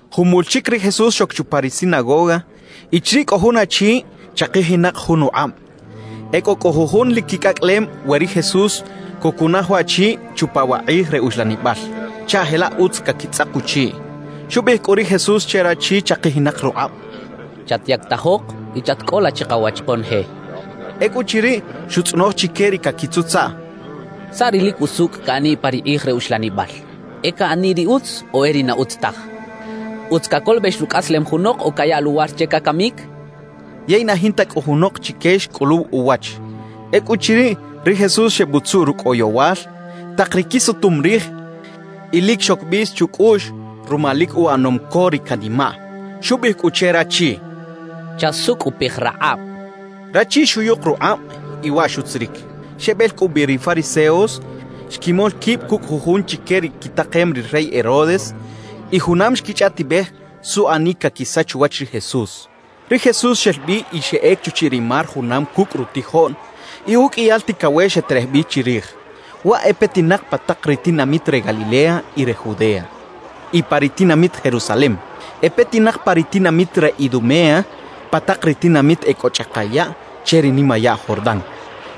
Jumul chik ri Jesús xok chupa ri sinagoga y chiriꞌ kꞌo jun achi chaqijinaq jun uqꞌabꞌ. E kꞌo kꞌu jujun lik kikꞌakꞌalem we ri Jesús kukunaj waꞌchi chupa wa qꞌij re uxlanibꞌal, chaꞌ jelaꞌ utz kakitzꞌaq uchiꞌ. Xubꞌiꞌij kꞌu ri Jesús che rachi chaqijinaq ruqꞌabꞌ: —Chatyaktajoq y chatkꞌola chiqawach qonoje —xchaꞌ. Ekꞌuchiriꞌ, xutzꞌonoj chike ri kakitzutzaꞌ: —¿Saꞌ ri lik usukꞌ kaꞌaniꞌ pa ri qꞌij re uxlanibꞌal: E kaꞌaniꞌ ri utz o e ri na utz taj? ¿Utz kakolobꞌex rukꞌaslem junoq o kayaꞌ luwar che kakamik? —xchaꞌ. Yey na jinta kꞌu junoq chike xkꞌuluw uwach. Ekꞌuchiriꞌ, ri Jesús xebꞌutzuꞌ rukꞌ oyowal taq ri kisutum rij y lik xok bꞌis chukꞌuꞌx ruma lik uꞌanom ko ri kanimaꞌ. Xubꞌiꞌij kꞌu che rachi: —Chasukꞌupij raqꞌabꞌ —xcha che. Rachi xuyuq ruqꞌabꞌ y waꞌ xutzirik. Xebꞌel kꞌu bꞌi ri fariseos, xkimol kibꞌ kukꞌ jujun chike ri kitaqem ri rey Herodes, y junam xkichꞌaꞌtibꞌej suꞌanik kakisach uwach ri Jesús. Ri Jesús xel bꞌi y xeꞌek chuchiꞌ ri mar junam kukꞌ rutijoꞌn. Y ukꞌiyal tikawex xeterej bꞌi chirij. Waꞌ e petinaq pa taq ri tinamit re Galilea y re Judea y pa ri tinamit Jerusalem; e petinaq pa taq ri tinamit re Idumea, pa taq ri tinamit e kꞌo chꞌaqa yaꞌ che ri nimayaꞌ Jordán,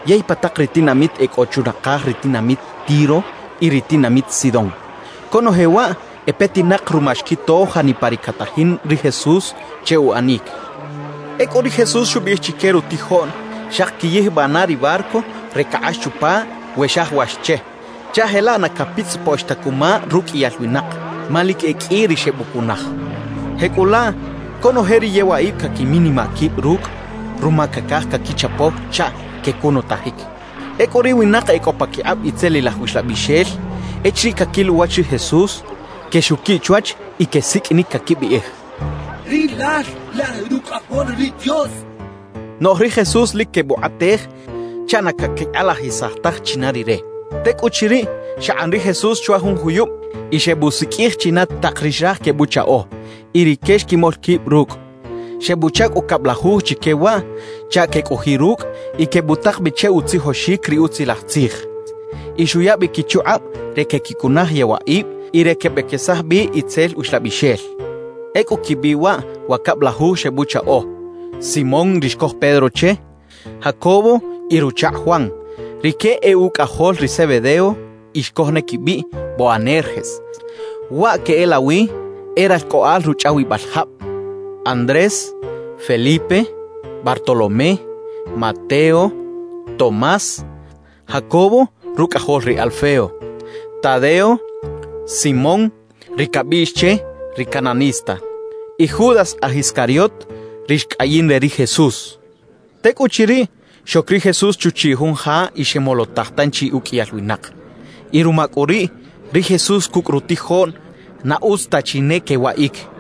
yey pa taq ri tinamit e kꞌo chunaqaj ri tinamit Tiro y ri tinamit Sidón. Konoje waꞌ e petinaq ruma xkito janipa ri katajin ri Jesús che uꞌanik. Ekꞌu ri Jesús xubꞌiꞌij chike rutijoꞌn, xaqi kiyijbꞌaꞌ na ri barco re kaqꞌax chupa we xajawax che, chaꞌ jelaꞌ na kapitzꞌipoꞌx ta kuma rukꞌiyal winaq; ma lik e kꞌi ri xebꞌukunaj. Jekꞌulaꞌ konoje ri yewaꞌibꞌ kakiminimaꞌ kibꞌ rukꞌ, ruma kakaj kakichapo chaꞌ kekunutajik. Ekꞌu ri winaq e kꞌo pakiqꞌabꞌ itzelilaj uxlabꞌixel, echiriꞌ kakil uwach ri Jesús, kexukiꞌ chwach y kesikꞌinik kakibꞌiꞌij: «¡Rilal lal Rukꞌajol ri Dios!» kechaꞌ. Noꞌj ri Jesús lik kebꞌuqꞌatej chaꞌ na kakiqꞌalajisaj taj china Rire. Tekꞌuchiriꞌ, xaqꞌan ri Jesús chwa jun juyubꞌ y xebꞌusikꞌij china taq ri xraj kebꞌuchaꞌo, y rike xkimol kibꞌ rukꞌ. Xebꞌuchaꞌ kꞌu kabꞌlajuj chike waꞌ chaꞌ kekꞌojiꞌ rukꞌ y kebꞌutaq bꞌi che utzijoxik ri Utzilaj Tzij. Y xuya bꞌi kichuqꞌabꞌ re kekikunaj yewaꞌibꞌ y re kebꞌekesaj bꞌi itzel uxlabꞌixel. Ekꞌu kibꞌiꞌ waꞌ wa kabꞌlajuj xebꞌuchaꞌo: Simón ri xkoj Pedro che, Jacobo y ruchaqꞌ Juan (rike e ukꞌajol ri Zebedeo y xkoj ne kibꞌiꞌ “Boanerges”, waꞌ keꞌelawi “E ralkꞌoꞌal ruchꞌawibꞌal jabꞌ”), Andrés, Felipe, Bartolomé, Mateo, Tomás, Jacobo rukꞌajol ri Alfeo, Tadeo, Simón, ri kabꞌiꞌx che “ri Cananista”, y Judas aj Iscariot, ri xkꞌayin re ri Jesús. Tekꞌuchiriꞌ, xok ri Jesús chuchiꞌ jun ja y xemolotaj tanchi ukꞌiyal winaq. Y ruma kꞌu riꞌ, ri Jesús kukꞌ rutijoꞌn na utz ta chi ne kewaꞌik.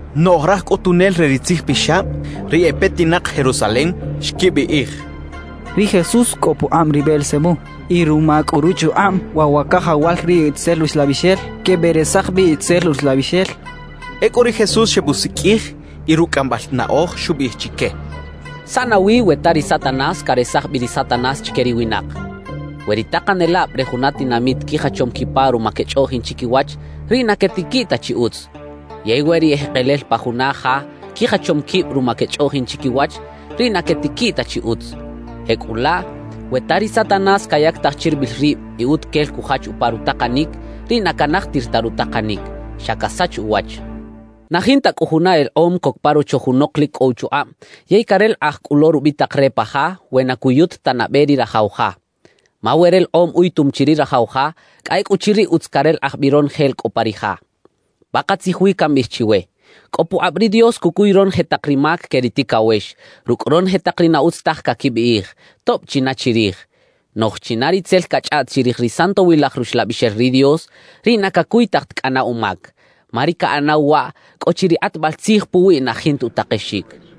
Noꞌj raj kꞌutunel re ri tzijpixabꞌ, ri e petinaq Jerusalem, xkibꞌiꞌij: «Ri Jesús kꞌo puqꞌabꞌ ri Beelzebú» y «Ruma kꞌu ruchuqꞌabꞌ waꞌ wa kajawal ri itzel uxlabꞌixel, kebꞌeresaj bꞌi itzel uxlabꞌixel» xechaꞌ. Ekꞌu ri Jesús xebꞌusikꞌij y rukꞌ kꞌambꞌal naꞌoj xubꞌiꞌij chike: «¿Saꞌ nawi we ta ri Satanás karesaj bꞌi ri Satanás chike ri winaq? We ri taqanelabꞌ re juna tinamit kijachom kipa ruma kechꞌoꞌjin chikiwach, riꞌ na ketikiꞌ ta chi utz. Yey we ri ejeqelel pa juna ja kijachom kibꞌ ruma kechꞌoꞌjin chikiwach, riꞌ na ketikiꞌ ta chi utz. Jekꞌulaꞌ, we ta ri Satanás kayaktaj chiribꞌil ribꞌ y utukel kujach upa rutaqanik, riꞌ na kanajtir ta rutaqanik, xa kasach uwach. »Na jinta kꞌu juna eleqꞌom kok pa rocho junoq lik kꞌo uchuqꞌabꞌ yey kareleqꞌaj kꞌu lo rubꞌitaq re pa ja, we na kuyut ta nabꞌe ri rajaw ja. Ma we releqꞌom uyutum chi ri rajaw ja, kꞌa ekꞌuchiriꞌ utz kareleqꞌaj bꞌi ronoje la kꞌo pa ri ja. Paqatzij wi kambꞌiꞌij chiwe: Kꞌo puqꞌabꞌ ri Dios kukuy ronoje taq ri mak ke ri tikawex, rukꞌ ronoje taq ri na utz taj kakibꞌiꞌij, tobꞌ china chirij; noꞌj china ri tzel kachꞌaꞌt chirij ri Santowilaj Ruxlabꞌixel ri Dios, riꞌ na kakuytaj ta kꞌana umak. Ma ri kaꞌanaw waꞌ, kꞌo chi ri qꞌatbꞌal tzij puwiꞌ na jinta utaqexik» xchaꞌ.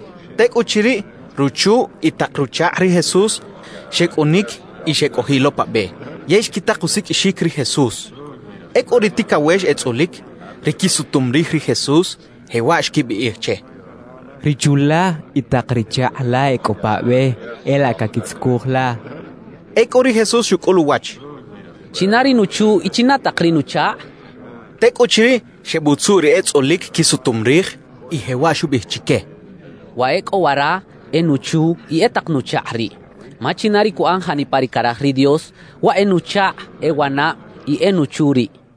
Tekꞌuchiriꞌ, ruchu y taq ruchaqꞌ ri Jesús xekꞌunik y xekꞌojiꞌ lo pa bꞌe, yey xkitaq usikꞌixik ri Jesús. Ekꞌu ri tikawex etzꞌulik, ri kisutum rij ri Jesús, jewaꞌ xkibꞌiꞌij che: —Ri chu la y taq ri chaqꞌ la e kꞌo pa bꞌe, e laꞌ kakitzukuj la —xecha che. Ekꞌu ri Jesús xukꞌul uwach: —¿China ri nuchu y china taq ri nuchaqꞌ? —xchaꞌ. Tekꞌuchiriꞌ, xebꞌutzuꞌ ri etzꞌulik kisutum rij y jewaꞌ xubꞌiꞌij chike: —Wa e kꞌo wara e nuchu y e taq nuchaqꞌ riꞌ. Ma china ri kuꞌan janipa ri karaj ri Dios, waꞌ e nuchaqꞌ, e wanabꞌ y e nuchu riꞌ —xchaꞌ.